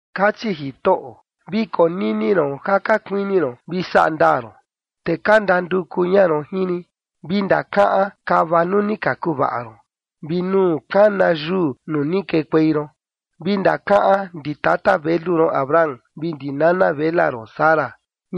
Kachi Jitoꞌo: “Vi konini ron ja ka kuini ron vi saꞌa ndaa ron, te ka ndanduku ña ron jin rin. Vi ndakaꞌan kava nuu ni ka kuvaꞌa ron, vi nuu kana yuu nuu ni kekuei ron. Vi ndakaꞌan ndi tata velu ron Abraham vi ndi nana vela ron Sara,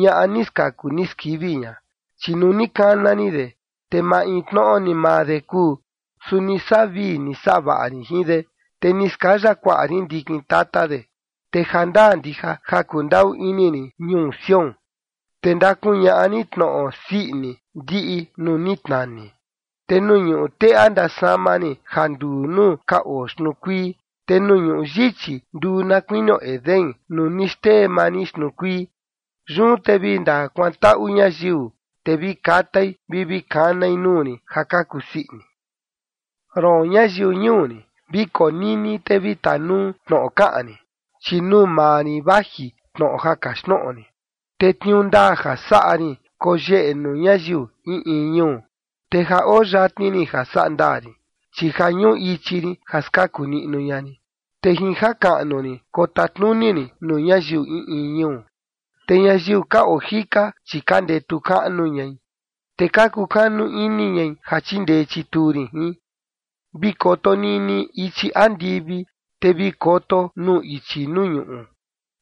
ñaꞌa ni skaku ni skivi ña, chi nuu ni kana rin de, te maintnoꞌo ni maa de kuu, su ni saꞌa vii ni saꞌa vaꞌa rin jin de, te ni skaya kuaꞌa rin ndikin tata de. Te jandaa ndija ja kundaꞌu ini rin ñuu Sión, te ndakuñaꞌa rin tnoꞌo sii ini ndiꞌi nuu ni tnani, te nuu ñuꞌu teꞌa ndasama rin ja nduu nuu ka oo xtnuu kuii, te nuu ñuꞌu yichi nduu na kuinio Edén, nuu ni xtee maa rin xtnuu kuii. Yun te vi ndakuantaꞌu ñayiu, te vi katai vi vi kanai nuu rin ja ka kusii ini.” “Roon, ñayiu ñuu rin, vi konini te vi tanuu tnoꞌo kaꞌan rin, chi nuu maa rin vaji tnoꞌo ja kaxtnoꞌo rin, te tniuu ndaa ja saꞌa rin koyeꞌe nuu ñayiu in in ñuu. Te ja oo yatni rin ja sandaa rin, chi ja ñuꞌu ichi rin ja skaku niꞌnu ña rin, te jin jakaꞌnu rin kotatnuni rin nuu ñayiu in in ñuu. Te ñayiu ka oo jika, chi ka ndetu kaꞌnu ñai, te ka kukanu ini ñai ja chindee chituu rin jin. Vi koto niꞌni ichi andivi, te vi koto nuu ichi nuu ñuꞌu,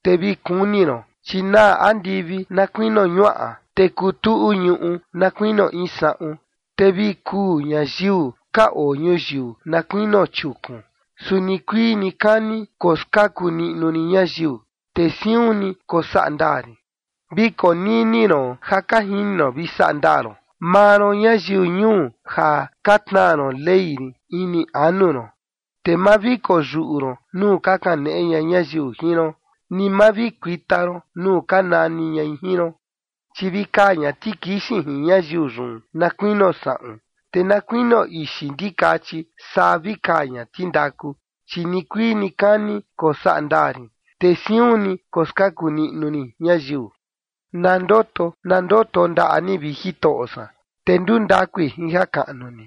te vi kuni ron, chi naa andivi na kuinio ñuaꞌa, te kutuꞌu ñuꞌu na kuinio in saꞌun, te vi kuu ñayiu ka oo ñuyiu na kuinio chiukun, su nikuii nikani koskaku niꞌnu rin ñayiu, te siun ni kosaꞌa ndaa rin. Vi konini ron ja ka jini ron vi saꞌa ndaa ron, maa ron ñayiu ñuu ja ka tnaa ron Ley rin ini anu ron. Te ma vi koyuꞌu ron nuu ka kaneꞌe ña ñayiu jin ron, ni ma vi kuita ron nuu ka nani ñai jin ron. Chi vi kaa ña tikixin jin ñayiu yun na kuinio saꞌun, te na kuinio ixi ndikachi saa vi kaa ña tindaku. Chi nikuii nikani kosaꞌa ndaa rin, te siun ni koskaku niꞌnu rin ñayiu.” Na ndoto, na ndoto ndaꞌa ni, vi Jitoꞌo san, te ndundakui jin jakaꞌnu ni.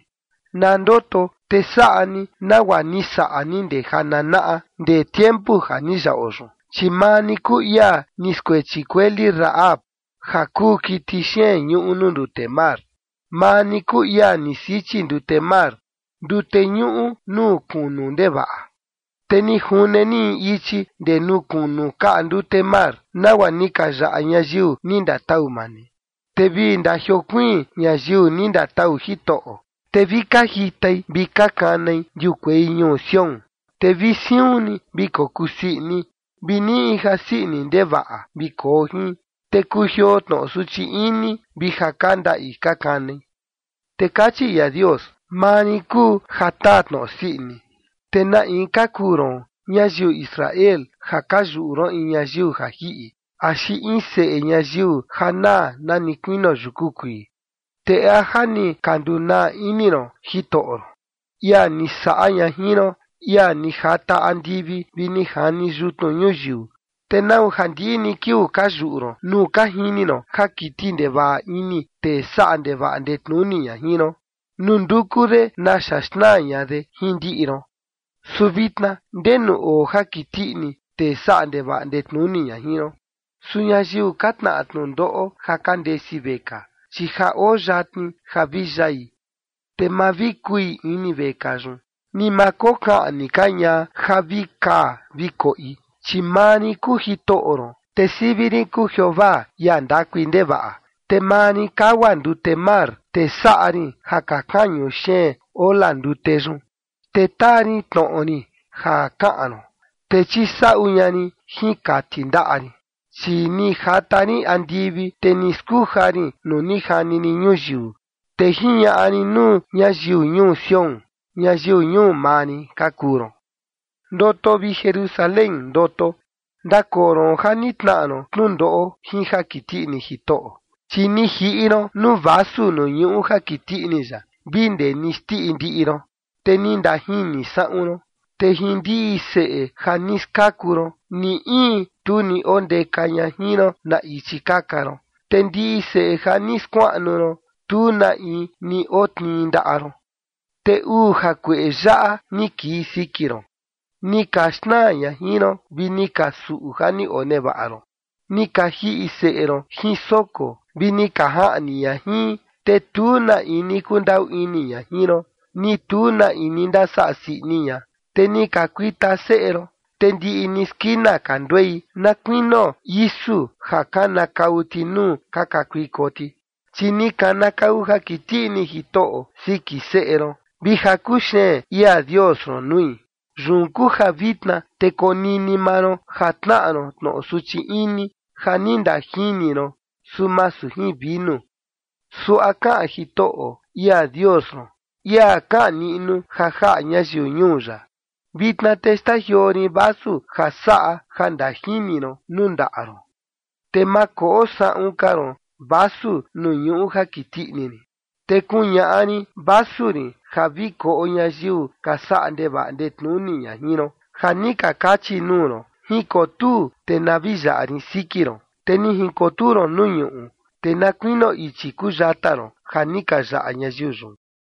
Na ndoto te saꞌa ni nagua ni saꞌa ni ndee jananaꞌa, ndee tiempu ja ni yaꞌo yun, chi maa ni kuu ia ni skuechi kueli Rahab, ja kuu kiti xeen ñuꞌu nuu ndute mar. Maa ni kuu ia ni sichi ndute mar, ndute ñuꞌu nuu kunu ndevaꞌa, te ni june ni in ichi ndee nuu kunu kaꞌa ndute mar, nagua ni ka yaꞌa ñayiu ni ndatau maa ni. Te vi ndajiokuiin ñayiu ni ndatau Jitoꞌo, te vi ka jitai vi ka kanai ndiukuei ñuu Sión. Te vi siun ni vi kokusii ini, vi niꞌi in jasii ini ndevaꞌa vi koo jin, te kujioo tnoꞌo suchi ini vi ja ka ndaꞌi ka kanai. Te kachi ia Dios: “Maa rin kuu ja taa tnoꞌo sii ini, ¿te na in ka kuu ron, ñayiu Israel, ja ka yuꞌu ron in ñayiu ja jiꞌi, axi in seꞌe ñayiu ja naa nani kuinio yuku kuii? ¿Te a ja ni ka ndunaa ini ron Jitoꞌo ron, ia ni saꞌa ña jin ron, ia ni jata andivi vi ni jani yutnu ñuyiu? ¿Te nau ja ndiꞌi ni kiuu ka yuꞌu ron nuu ka jini ron ja kiti ndevaꞌa ini tee saꞌa ndevaꞌa ndetnuni ña jin ron nuu nduku de naxa xnaa ña de jin ndiꞌi ron? Su vitna, ¿ndenu oo jakiti ini tee saꞌa ndevaꞌa ndetnuni ña jin ron? Su ñayiu ka tnaꞌa tnundoꞌo ja ka ndesi vekaa, chi ja oo yatni ja vi yai, te ma vi kui ini vekaa yun, ni ma kokaꞌni ka ña ja vi kaa vi koꞌi. Chi maa rin kuu Jitoꞌo ron, te sivi rin kuu Jeovaa, ia ndakui ndevaꞌa. Te maa rin kagua ndute mar, te saꞌa rin ja ka kañu xeen ola ndute yun. Te taa rin tnoꞌo rin ja kaꞌan ron, te chisaꞌu ña rin jin kati ndaꞌa rin, chi ni jata rin andivi, te ni skuja rin nuu ni jani rin ñuyiu, te jiñaꞌa rin nuu ñayiu ñuu Sión: Ñayiu ñuu maa rin ka kuu ron.” Ndoto, vi Jerusalén, ndoto. Ndakoo ron ja ni tnaꞌa ron tnundoꞌo jin jakiti ini Jitoꞌo, chi ni jiꞌi ron nuu vasu nuu ñuꞌu jakiti ini ya vi ndee ni xndiꞌi ndiꞌi ron, te ni ndajini saꞌun ron. Te jin ndiꞌi seꞌe ja ni skaku ron, ni in tu ni ondeka ña jin ron na ichi kaka ron, te ndiꞌi seꞌe ja ni skuaꞌnu ron, tu na in ni otnii ndaꞌa ron. Te uu jakueꞌe yaꞌa ni kii siki ron: Ni ka xnaa ña jin ron, vi ni ka suꞌu ja ni onevaꞌa ron. Ni ka jiꞌi seꞌe ron jin soko, vi ni ka jaꞌni ña jin. Te tu na in ni kundaꞌu ini ña jin ron, ni tu na in ni ndasaꞌa sii ini ña. Te ni ka kuita seꞌe ron, te ndiꞌi ni skina ka nduei na kuinio isu ja kanakau ti nuu ka kakuiko ti. Chi ni kanakau jakiti ini Jitoꞌo siki seꞌe ron, vi jakuxeen ia Dios ron nui. Yun kuu ja vitna te konini maa ron ja tnaꞌa ron tnoꞌo suchi ini ja ni ndajini ron, su masu jin vinu. Suaꞌa kaꞌan Jitoꞌo, ia Dios ron, ia kaꞌan niꞌnu ja jaꞌa ñayiu ñuu ya: “Vitna te xtajioo rin vasu ja saꞌa ja ndajini ron nuu ndaꞌa ron, te ma koꞌo saꞌun ka ron vasu nuu ñuꞌu jakiti ini rin. Te kuñaꞌa rin vasu rin ja vi koꞌo ñayiu ka saꞌa ndevaꞌa ndetnuni ña jin ron, ja ni ka kachi nuu ron: Jinkotuu te na vi yaꞌa rin siki ron. Te ni jinkotuu ron nuu ñuꞌu, te na kuinio ichi kuu yata ron ja ni ka yaꞌa ñayiu yun.”